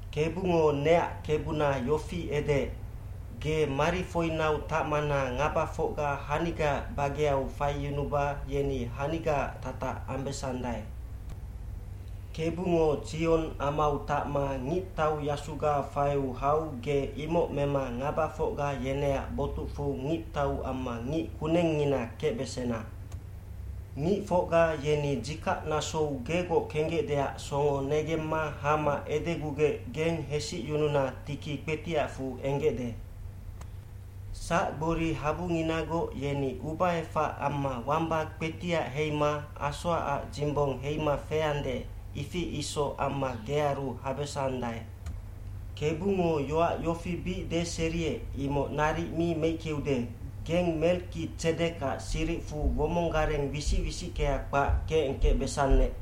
aKebungo neac Kebuna yofi edeec, “Ge marifoinau tacmana ngabafocga hanigaac bageau faiyunuba yeni hanigaac tatac ambesandae.” Kebungo Tsion amau tacma ngictauyasuga faiu hau ge imoc mema ngabafocga yeneac botucfu ngictau amma ngic kunengngina kecbesena. Ngicfocga yeni dzikac nasou gegoc kenggecdeac songo negemma hama edegugec geng hesicyununa tiki kpetiacfu enggecde. Sacgbori habunginagoc yeni ubaefac amma wamba kpetiac heima asoacac dzimbong heima feande, ifi isoc amma gearu habesandae. bKebungo yoac yofi bic deseriec, imoc naric mi meickeude, “Geng Melkitsedekac siricfu womonggareng wisic wisickea kpac kecengkecbesannec.”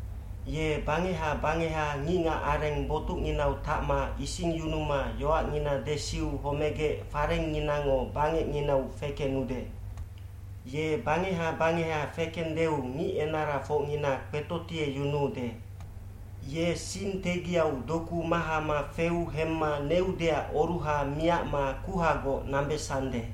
Ye bangeha bangeha ngicngacareng botucnginau tacma isingyunuma yoacngina desiu homegec farengnginango bangecnginau fekenude. Ye bangeha bangeha fekendeu ngicenarafocngina kpetotieyunuude. Ye sing tegiau doku mahama feu hemma neudeac oruha miacma kuhagoc nambesande.